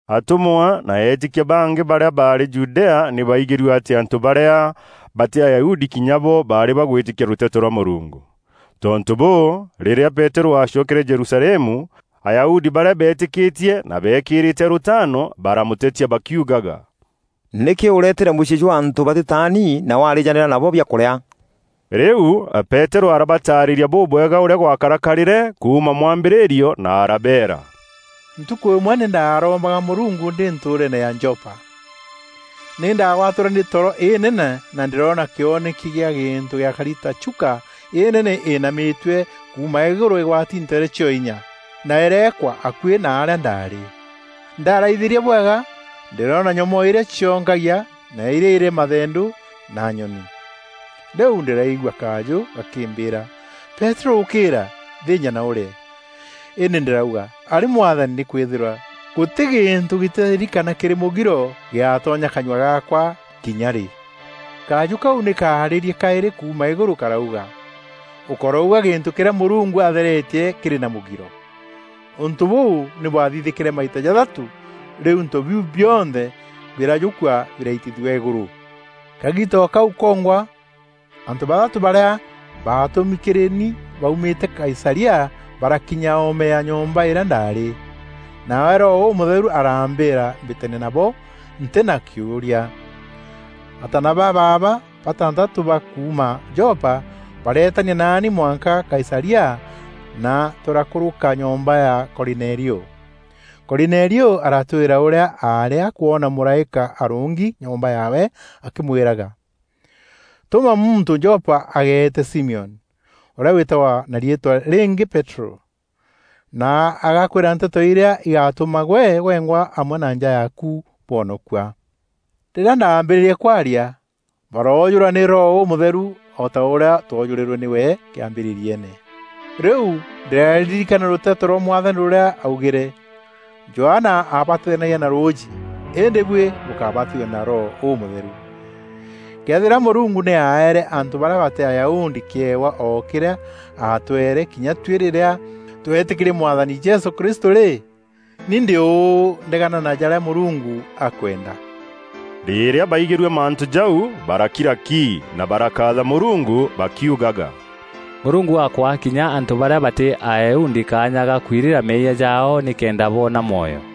Atûmwa na eetîkia bangî barîa baarî Judea nî baaigîrue atî antû barîa batî Ayahudi kinya bo baarî bagwîtîkia rûteto rwa Mûrungu. Tontû bûû, rîrîa Peterû aacokere Jerusalemu, Ayahudi barîa beetîkîtie na beekîîrîte rûtaano, baramûtetia bakiugaga, “Nîkî ûreetîre mûciî jwa antû batîtaani na warîjanîra nabo biakûrîa?” Rîu Peterû arabataarîria bûbwega ûrîa gwakarakarîre kuuma mwambîrîrio na arabeera, “Ntukû îmwe nî ndaarombaga Mûrungu ndî ntûûreene ya Jopa. Nî ndaagwatîrwe nî toro înene na ndîroona kîoneki gîa gîntû gîakari ta chuka înene înamîtue, kuuma îgûrû îgwati nteere cio-inya, na îreekwa akuî na arîa ndaarî. Ndaaraithîria bwega, ndîroona nyomoo irîa cionkagia na irîa irî mathendû na nyoni. Rîu ndîraigua kajû gakîmbîîra: ‘Peterû ûkîîra! Thînja na ûrîe.’ Îndî ndîrauga, ‘Arî Mwathani; nîkwîthîrwa gûtî gîntû gîtîtheri kana kîrî mûgiro gîatonya kanyua gaakwa kinya rî.’ Kajû kau nî kaarîrîe kaîrî kuuma îgûrû karauga, ‘Ûkorouga gîntû kîrîa Mûrungu atheretie kîrî na mûgiro.’ Ûntû bûu nî bwathithîkîre maita jathatû, rîu into biu bionthe birajûkua biraitithua îgûrû. Kagiita o kau kongwa, antû bathatû barîa baatûmi kîrî ni baumîte Kaisaria, barakinya oome ya nyomba îrîa ndaarî. Nawe Roho Ûmûtheru arambîîra mbîtanie nabo ntî na kîûria. Ataana ba baaba batantatû ba kuuma Jopa bareetania naani mwanka Kaisaria na tûrakûrûka nyomba ya Korinelio. Korinelio aratwîra ûrîa aarî akwona mûraîka arûngi nyomba yaawe akîmwîraga: ‘Tûma muntû Jopa ageete Simioni, ûrîa wîtagwa na riîtwa rîngî Peterû na agakwîra nteto irîa igatûma gwe gwengwa amwe na nja yaaku bwonokua.’ Rîrîa ndaambîrîrie kwaria, baroojûrwa nî Roho Ûmûtheru o ta ûrîa twojûrîrwe nîwe kîambîrîriene. Rîu ndîraririkana rûteto rwa Mwathani rûrîa augîre: ‘Johana aabatithanagia na rûûjî îndî buî bûkabatithua na Roho Ûmûtheru.’ Këethîra Mûrungu nî aaere antû barîa batî Ayahudi kîewa o kîrîa aatweere kinya tuî rîrîa tweetîkîrie Mwathani Jesû Kristû rî, ni ndî ûû ndegana na jarîa Mûrungu akwenda?” Rîrîa baigîrue mantû jau, barakira ki na barakaatha Mûrungu bakiugaga, “Mûrungu akwaa kinya antû barîa batî Ayahudi kaanya ga kwirira meeyia jaao nîkenda boona mwoyo.”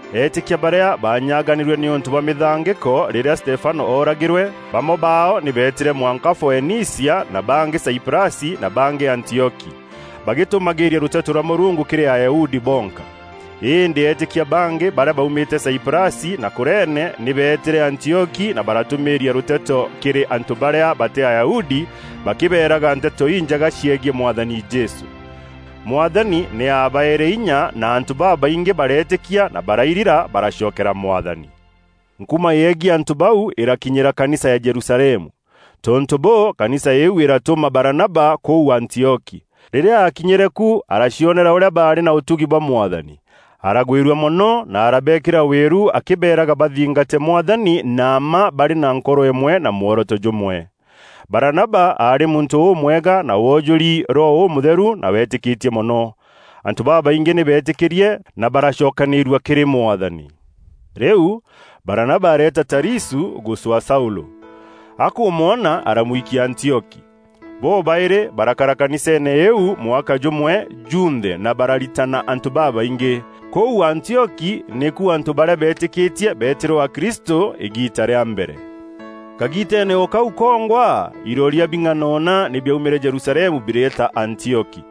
Eetîkia barîa baanyaganîrue nîûntû bwa mîthangîko rîrîa Stefano ooragîrwe, bamwe baao nî beetîre mwanka Foenicia, na bangî Saiprasi na bangî Antioki, bagîtûmagîîria rûteto rwa Mûrungu kîrî Ayahudi bonka. Îndî eetîkia bangî barîa baumîte Saiprasi na Kurene nî beetîre Antioki na baratûmîîria rûteto kîrî antû barîa batî Ayahudi bakîbeeraga Nteto Injega ciegiî Mwathani Jesû. Mwathani nî aabaeere inya na antû babaingî bareetîkia na barairira baracokeera Mwathani. Nkuma yegiî antû bau îrakinyîra kanisa ya Jerusalemu. Tontû bûû, kanisa îîu îratûma Baranaba kûu Antioki. Rîrîa aakinyîre ku aracionera ûrîa baarî na ûtugi bwa Mwathani, aragwîrua mono na arabeekîra wîru akîbeeraga bathingate Mwathani na mma barî na nkoro îmwe na mworoto jûmwe. Baranaba aarî muntû ûmwega na woojûri Roho Ûmûtheru na weetîkîtie mono. Antû babaingî nî beetîkîrie na baracokanîîrua kîrî Mwathani. Rîu Baranaba areeta Tarisû gûcwaa Saûlû. Akûmwona, aramwikia Antioki. Bobaîrî barakara kaniseene îîu mwaka jûmwe junthe na bararitana antû babaingî. Kûu Antioki nîku antû barîa beetîkîtie beetîrwe akristû îgiita rîa mbere. Kagiiteene o kau kongwa, iroria bing'anona nî biaumîre Jerusalemu bireeta Antioki.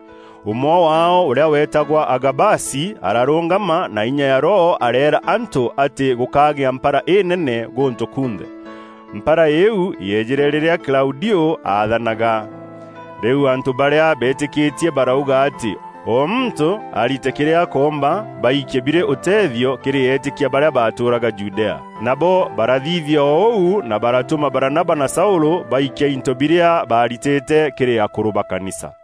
Ûmwe waao, ûrîa weetagwa Agabasi, ararûngama na inya ya Roho areera antû atî gûkagîa mpara înene gûntû kunthe. Mpara îîu yeejîre rîrîa Klaudiû aathanaga. Rîu antû barîa beetîkîtie barauga atî o muntû arite kîrîa akoomba, baikie birî ûteethio kîrî eetîkia barîa baatûûraga Judea. Nabo barathithia ûu na baratûma Baranaba na Saûlû baikia into birîa baaritîte kîrî akûrû ba kanisa.